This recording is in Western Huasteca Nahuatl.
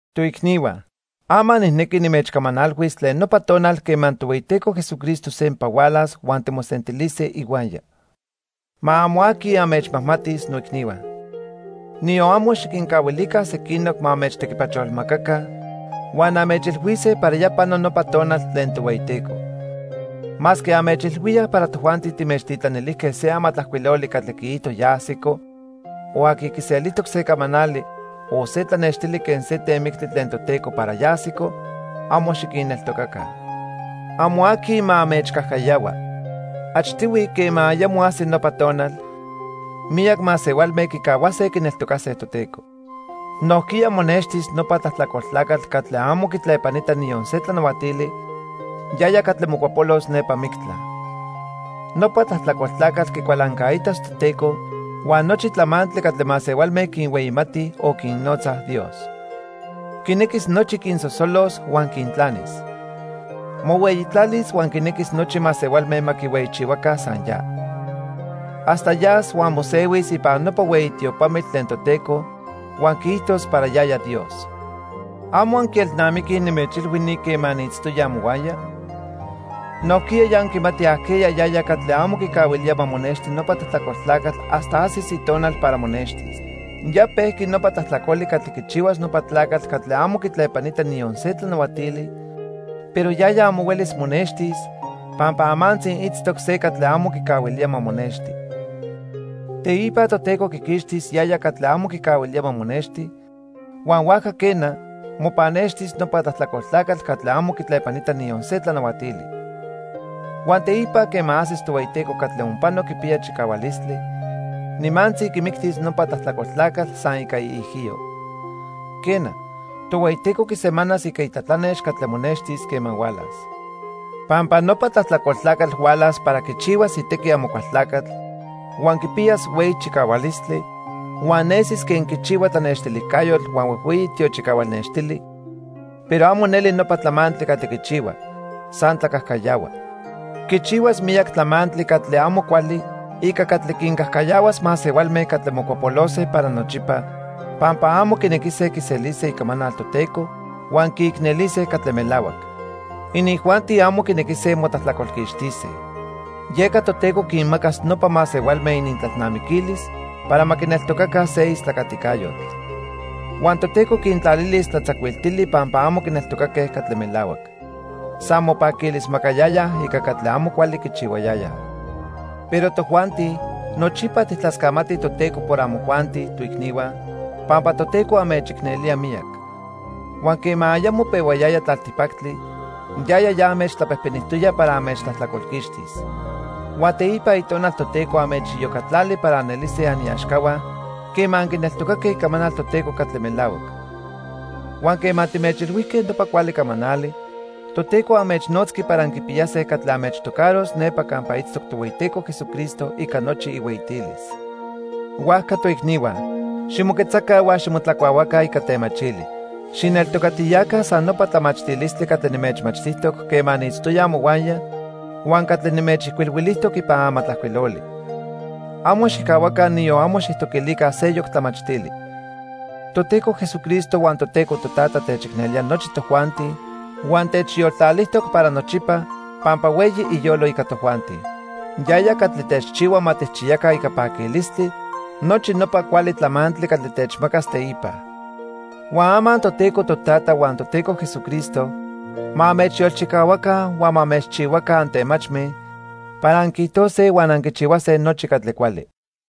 Toicnihua, ama nijnequi nimechcamanalhuis tlen nopa tonal quema Tohueyiteco Jesucristo sempa hualas huan timosentilise ihuaya. Ma amo aqui anmechmajmatis, noicnihua. Niyon amo xiquincahuilica sequinoc ma anmechtequipacholmacaca huan anmechilhuise para ya pano nopa tonal tlen Tohueyiteco. Masque anmechilhuíaj para tojuanti timechtitlanilijque se amatlajcuiloli catli quiijto ya ajsico, o aqui quiselijtoc se camanali, o se tlanextili quen se temictli tlen Toteco para ya ajsico, amo xiquinneltocaca. Amo aqui ma anmechcajcayahua. Achtihui, quema ayamo ajsi nopa tonal, miyac masehualme quicahuase quineltocase Toteco. Nojquiya monextis nopa tlajtlacol tlacatl catli amo quitlepanita niyon se tlanahuatili, yaya catli mocuapolos nepa mictla. Nopa tlajtlacol tlacatl quicualancaitas Toteco huan nochi tlamantli catli masehualme quinhueyimatij o quinnotzaj "dios". Quinequis nochi quinsosolos huan quintlanis. Mohueyitlalis huan quinequis nochi masehualme ma quihueyichihuaca san ya. Hasta yas huan mosehuis ipan nopa hueyi tiopamitl tlen Toteco huan quiijtos para yaya Dios. ¿Amo anquielnamiquij nimechilhui ni quema niitztoya amohuaya? Nojquiya ya anquimatij ajqueya yaya catli amo quicahuilía ma monexti nopa tlajtlacol tlacatl hasta ajsis itonal para monextis. Ya pejqui nopa tlajtlacoli catli quichihuas nopa tlacatl catli amo quitlepanita niyon se tlanahuatili, pero yaya amo huelis monextis, pampa amantzi itztoc se catli amo quicahuilía ma monexti. Teipa Toteco quiquixtis yaya catli amo quicahuilía ma monexti, huan huajca quena, mopannextis nopa tlajtlacol tlacatl catli amo quitlepanita niyon se tlanahuatili. Huan teipa, quema ajsis Tohueyiteco catli onpano quipiya chicahualistli, nimantzi quimictis nopa tlajtlacol tlacatl san ica iijiyo. Quena, Tohueyiteco quisemanas ica itlatlanex catli monextis quema hualas. Pampa nopa tlajtlacol tlacatl hualas para quichihuas itequi Amocualtlacatl, huan quipiyas hueyi chicahualistli, huan nesis quen quichihua tlanextilijcayotl huan huejhueyi tiochicahual nextili, pero amo neli nopa tlamantli catli quichihua, san tlacajcayahua. Quichihuas miyac tlamantli catli amo cuali ica catli quincajcayahuas masehualme catli mocuapolose para nochipa pampa amo quinequise quiselise icamanal Toteco huan quiicnelise catli melahuac. Inijuanti amo quinequise motlajtlacolquixtise. Yeca Toteco quinmacas nopa masehualme inintlalnamiquilis para ma quineltocaca se istlacaticayotl. Huan Toteco quintlalilis tlatzacuiltili pampa amo quineltocaque catli melahuac. San mopaquilismacayayaj ica catli amo cuali quichihuayayaj. Pero tojuanti, nochipa tijtlascamatij Toteco por amojuanti, toicnihua, pampa Toteco anmechicnelía miyac. Huan quema ayamo pehuayaya tlaltipactli, yaya ya anmechtlapejpenijtoya para anmechtlajtlacolquixtis. Huan teipa Itonal Toteco anmechiyocatlali para anelise aniaxcahua quema anquineltocaque icamanal Toteco catli melahuac. Huan quema timechilhuijque nopa cuali camanali, Toteco anmechnotzqui para anquipiyase catli anmechtocaros nepa campa itztoc Tohueyiteco Jesucristo ica nochi ihueyitilis. Huajca, toicnihua, ximoquetzaca huan ximotlacuahuaca ica temachili. Xijneltocatiyaca san nopa tlamachtilistli catli nimechmachtijtoc quema niitztoya amohuaya huan catli nimechijcuilhuilijtoc ipan amatlajcuiloli. Amo xijcahuaca, niyon amo xijtoquilica seyoc tlamachtili. Toteco Jesucristo huan Toteco Totata techicnelía nochi tojuanti huan techyoltlalijtoc para nochipa pampa hueyi iyolo ica tojuanti. Yaya catli techchihua ma tijchiyaca ica paquilistli nochi nopa cuali tlamantli catli techmacas teipa. Huan ama Toteco Totata huan Toteco Jesucristo ma anmechyolchicahuaca huan ma anmechchihuaca antemachme para anquiijtose huan anquichihuase nochi catli cuali.